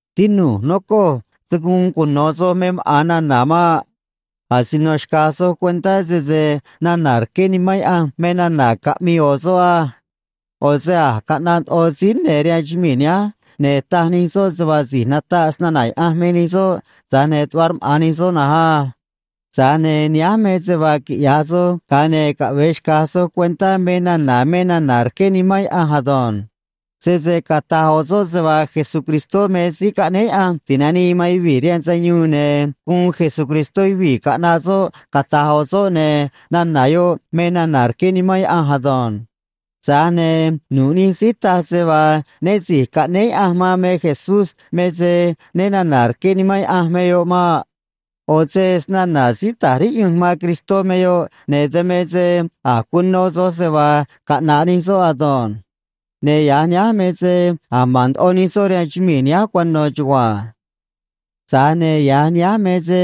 Tinu̱j, nocoj, se̱ guun cuno̱ soj me maꞌa̱n nana̱ maꞌ. Asino xca̱j soj cuentá sese nana̱ rqué Nimán Yaꞌanj me nana̱ caꞌmii ꞌo̱ soꞌ á. ꞌO̱ se a̱j caꞌnaꞌ ndoꞌo síí ne̱ rihaan chumii̱ nihánj, ne̱ taj nij soꞌ se vaa si̱j nataꞌ snana̱ Yaꞌanj me nij soꞌ, tza̱j ne̱ tuꞌva rmaꞌa̱n nij soꞌ na̱nj á. Tza̱j ne̱ nihánj me se vaa quiꞌya̱j soj, ga̱a ne̱ caꞌve̱e xca̱j soj cuentá me nana̱ me nana̱ rqué Nimán Yaꞌanj ado̱nj. Sese cata̱j ꞌo̱ soꞌ se vaa Jesucristó me Síí Caꞌnéé Yaꞌanj Ti̱nanii man Yuvii̱ rihaan Sayuun, ne̱ guun Jesucristó yuvii̱ caꞌnaꞌ soꞌ, cata̱j ꞌo̱ soꞌ, ne̱ nana̱ yoꞌ me nana̱ rqué Nimán Yaꞌanj ado̱nj. Tza̱j ne̱ nu̱ꞌ nij síí taj se vaa né si̱j caꞌnéé Yaꞌanj man me Jesús me se né na̱na̱ rqué Nimán Yaꞌanj me yoꞌ maꞌ. ꞌO̱ se snana̱ síí ta̱j riꞌyunj man Cristó me yoꞌ, ne̱ dan me se a̱j cuno soj se vaa caꞌna̱ꞌ nij soꞌ ado̱nj. Ne̱ ya̱j nihánj me se a̱j ma̱n ndoꞌo nij soꞌ rihaan chumii̱ nihánj cuano̱ chugua̱nj. Tza̱j ne̱ ya̱j nihánj me se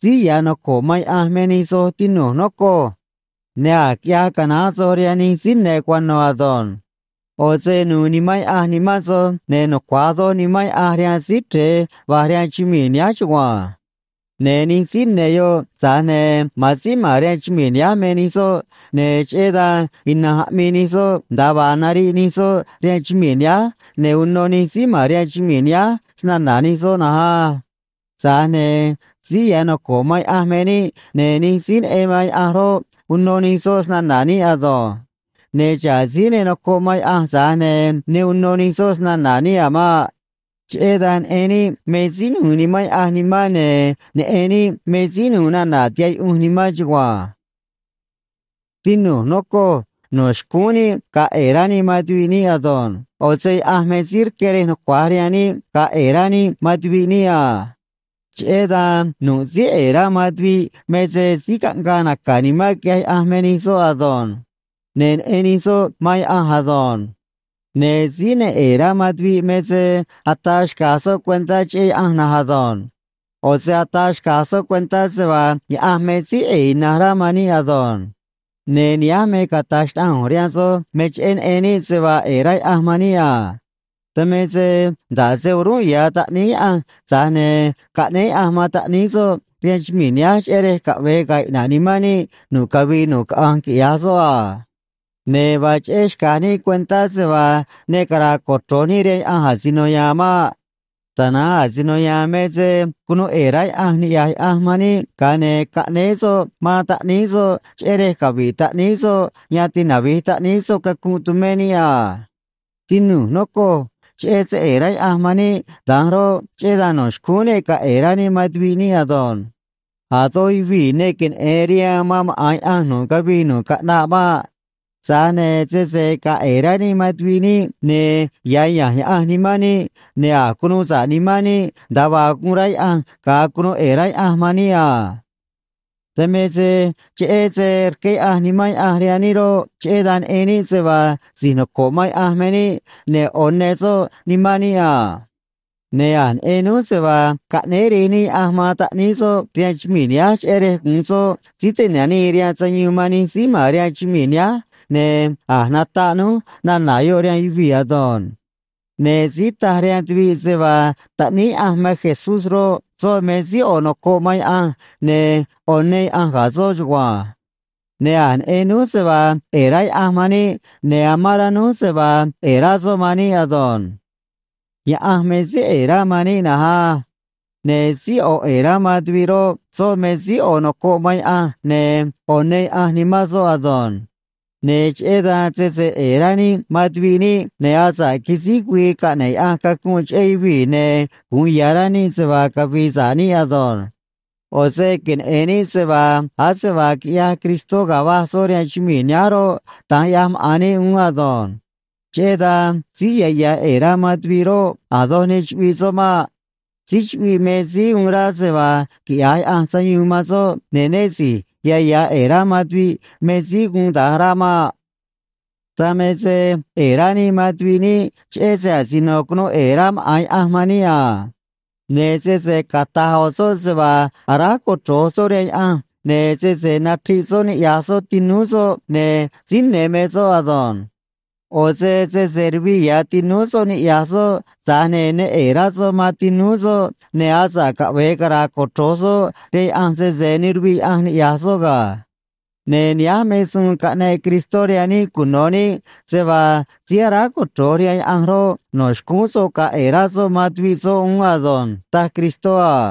síí ya̱ noco̱ꞌ man Yaꞌanj me nij soj, tinu̱j, nocoj. Ne̱ a̱j quiꞌyaj canaán soj rihaan nij síí ne̱ cuano̱ ado̱nj. ꞌO̱ se nu̱u̱ Nimán Yaꞌanj nimán soj, ne̱ nucua̱j doj Nimán Yaꞌanj rihaan Síí Chre̱e va̱j rihaan chumii̱ nihánj chugua̱nj. Ne̱ nij síí ne̱ yoꞌ, tza̱j ne̱ ma̱an síí ma̱n rihaan chumii̱ nihánj me nij soꞌ, ne̱ cheꞌé dan ina̱nj aꞌmii nij soꞌ nda̱a vaa nariꞌ nij soꞌ rihaan chumii̱ nihánj, ne̱ uno nij síí ma̱n rihaan chumii̱ nihánj snana̱ nij soꞌ na̱nj á. Tza̱j ne̱ síí ya̱ noco̱ꞌ man Yaꞌanj me níꞌ, ne̱ nij síí neꞌen man Yaꞌanj roꞌ, uno nij soꞌ snana̱ níꞌ ado̱nj. Ne̱ xa̱ꞌ síí ne nocoꞌ man Yaꞌanj, tza̱j ne̱ ne uno nij soꞌ snana̱ níꞌ a̱ maꞌ. Cheꞌé dan neꞌen níꞌ me síí nu̱u̱ Nimán Yaꞌanj nimán, ne̱ neꞌen níꞌ me síí nu̱u̱ nana̱ tihaꞌ yuꞌunj nimán chugua̱nj. Tinu̱j, nocoj, no̱ xcúún níꞌ ga̱a̱ ꞌe̱e̱ rá níꞌ man tuviꞌ níꞌ ado̱nj. ꞌO̱ se Yaꞌanj me síí rqué rej nucua̱j rihaan níꞌ ga̱a̱ ꞌe̱e̱ rá níꞌ man tuviꞌ níꞌ a. Cheꞌé dan nu̱ꞌ síí ꞌe̱e̱ rá man tuviꞌ me se síí caꞌngaa naca̱ nimán quiꞌyaj Yaꞌanj me nij soꞌ ado̱nj. Ne̱ neꞌen nij soꞌ man Yaꞌanj ado̱nj. Ne̱ síí ne ꞌe̱e̱ rá man tuviꞌ me se ataa xca̱j soꞌ cuentá cheꞌé Yaꞌanj na̱nj ado̱nj. ꞌO̱ se ataa xca̱j soꞌ cuentá se vaa Yaꞌanj me síí ꞌe̱e̱ ina̱nj rá man níꞌ ado̱nj. Ne̱ nihánj me cata̱j xnaꞌanj ꞌu̱nj rihaan soj me cheꞌé neꞌen níꞌ se vaa ꞌe̱e̱ rá Yaꞌanj man níꞌ a. Dan me se nda̱ꞌ se o̱rúnꞌ ya̱ Taꞌníí Yaꞌanj, tza̱j ne̱ caꞌnéé Yaꞌanj man Taꞌníí soꞌ rihaan chumii̱ nihánj, cheꞌé rej caꞌve̱e ga̱a̱ iꞌna̱ꞌ nimán níꞌ nu̱ꞌ cavii nu̱ꞌ caꞌanj quiꞌya̱j soꞌ a. Ne̱ vaa cheꞌé xca̱j níꞌ cuentá se vaa ne cara̱a̱ cochro̱j níꞌ rihaan Yaꞌanj asino ya̱a̱n maꞌ. Tana̱nj asino ya̱a̱n me se cunuu ꞌe̱e̱ rá Yaꞌanj niꞌya̱j Yaꞌanj man níꞌ, ga̱a ne̱ caꞌnéé soꞌ man Taꞌníí soꞌ cheꞌé rej cavi̱ꞌ Taꞌníí soꞌ yan tinavi̱j Taꞌníí soꞌ cacunꞌ tumé níꞌ a. Tinu̱j, nocoj, cheꞌé se ꞌe̱e̱ rá Yaꞌanj man níꞌ da̱nj roꞌ, cheꞌé dan no̱ xcúún níꞌ ga̱a̱ ꞌe̱e̱ rá níꞌ man tuviꞌ níꞌ ado̱nj. A̱ doj yuvii̱ ne queneꞌe̱n rihaan man maꞌa̱n Yaꞌanj nu̱ꞌ cavii nu̱ꞌ caꞌnaꞌ maꞌ. Tza̱j ne̱ sese ga̱a̱ ꞌe̱e̱ rá níꞌ man tuviꞌ níꞌ, ne̱ ya̱ ya̱nj Yaꞌanj nimán níꞌ, ne̱ a̱j cunuu sa̱ꞌ nimán níꞌ nda̱a vaa guun rá Yaꞌanj ga̱a cunuu ꞌe̱e̱ rá Yaꞌanj man níꞌ a. Dan me se cheꞌé se rqué Yaꞌanj Nimán Yaꞌanj rihaan níꞌ roꞌ, cheꞌé dan neꞌen níꞌ se vaa si̱j noco̱ꞌ man Yaꞌanj me níꞌ ne̱ ꞌo̱ ne soꞌ nimán níꞌ a. Ne̱ a̱j neꞌen núj se vaa caꞌnéé Rej níꞌ Yaꞌanj man Taꞌníí soꞌ rihaan chumii̱ nihánj cheꞌé rej gu̱un soꞌ Síí Ti̱nanii rihaan Sayuun man nij síí ma̱n rihaan chumii̱ nihánj, ne̱ a̱j nataꞌ núj nana̱ yoꞌ rihaan yuvii̱ ado̱nj. Ne̱ síí taj rihaan tuviꞌ se vaa Taꞌníí Yaꞌanj me Jesús roꞌ, soꞌ me síí ꞌo̱ nocoꞌ man Yaꞌanj, ne̱ ꞌo̱ ne Yaꞌanj ga̱ soꞌ chugua̱nj. Ne̱ a̱j neꞌen núj se vaa ꞌe̱e̱ rá Yaꞌanj man níꞌ, ne̱ amán rá núj se vaa ꞌe̱e̱ rá soꞌ man níꞌ ado̱nj. Yaꞌanj me síí ꞌe̱e̱ rá man níꞌ na̱nj á. Ne̱ síí ꞌo̱ ꞌe̱e̱ rá man tuviꞌ roꞌ, soꞌ me síí ꞌo̱ nocoꞌ man Yaꞌanj, ne̱ ꞌo̱ ne Yaꞌanj nimán soꞌ ado̱nj. Ne̱ cheꞌé dan sese ꞌe̱e̱ rá níꞌ man tuviꞌ níꞌ, ne̱ asa̱ꞌ quisíj güii caꞌne̱ꞌ Yaꞌanj cacunꞌ cheꞌé yuvii̱, ne̱ gu̱un ya̱ rá níꞌ se vaa cavi̱i̱ sa̱ꞌ níꞌ ado̱nj. ꞌO̱ se queneꞌe̱n níꞌ se vaa ase vaa quiꞌyaj Cristó ga̱a va̱j soꞌ rihaan chumii̱ nihánj roꞌ, da̱nj ꞌyaj maꞌa̱n níꞌ uún ado̱nj. Cheꞌé dan síí ya̱ ya̱ ꞌe̱e̱ rá man tuviꞌ roꞌ, a̱ doj ne chuꞌviꞌ soꞌ maꞌ. Síí chuꞌviꞌ me síí uun rá se vaa quiꞌya̱j Yaꞌanj sayuun man soꞌ, ne̱ né si̱j ya̱ ya̱ ꞌe̱e̱ rá man tuviꞌ me síí guun da̱nj rá maꞌ. Dan me se ꞌe̱e̱ rá níꞌ man tuviꞌ níꞌ cheꞌé se asino cunuu ꞌe̱e̱ rá maꞌa̱n Yaꞌanj man níꞌ a. Ne̱ sese cata̱j ꞌo̱ soꞌ se vaa aráj cochro̱j soꞌ rihaan Yaꞌanj, ne̱ sese nachriꞌ soꞌ niꞌya̱j soꞌ tinúú soꞌ, ne̱ síí ne̱ me soꞌ ado̱nj. ꞌO̱ se sese ruviꞌ ya̱ tinúú soꞌ niꞌya̱j soꞌ tza̱j ne̱ ne ꞌe̱e̱ rá soꞌ man tinúú soꞌ, ne̱ asa̱ꞌ caꞌve̱e cara̱a̱ cochro̱j soꞌ rihaan Yaꞌanj, sese ne ruviꞌ Yaꞌanj niꞌya̱j soꞌ ga̱. Ne̱ nihánj me suun caꞌneꞌ Cristó rihaan níꞌ cuno̱ níꞌ, se vaa síí aráj cochro̱j rihaan Yaꞌanj roꞌ, no̱ xcúún soꞌ ga̱a̱ ꞌe̱e̱ rá soꞌ man tuviꞌ soꞌ uún ado̱nj, taj Cristó a.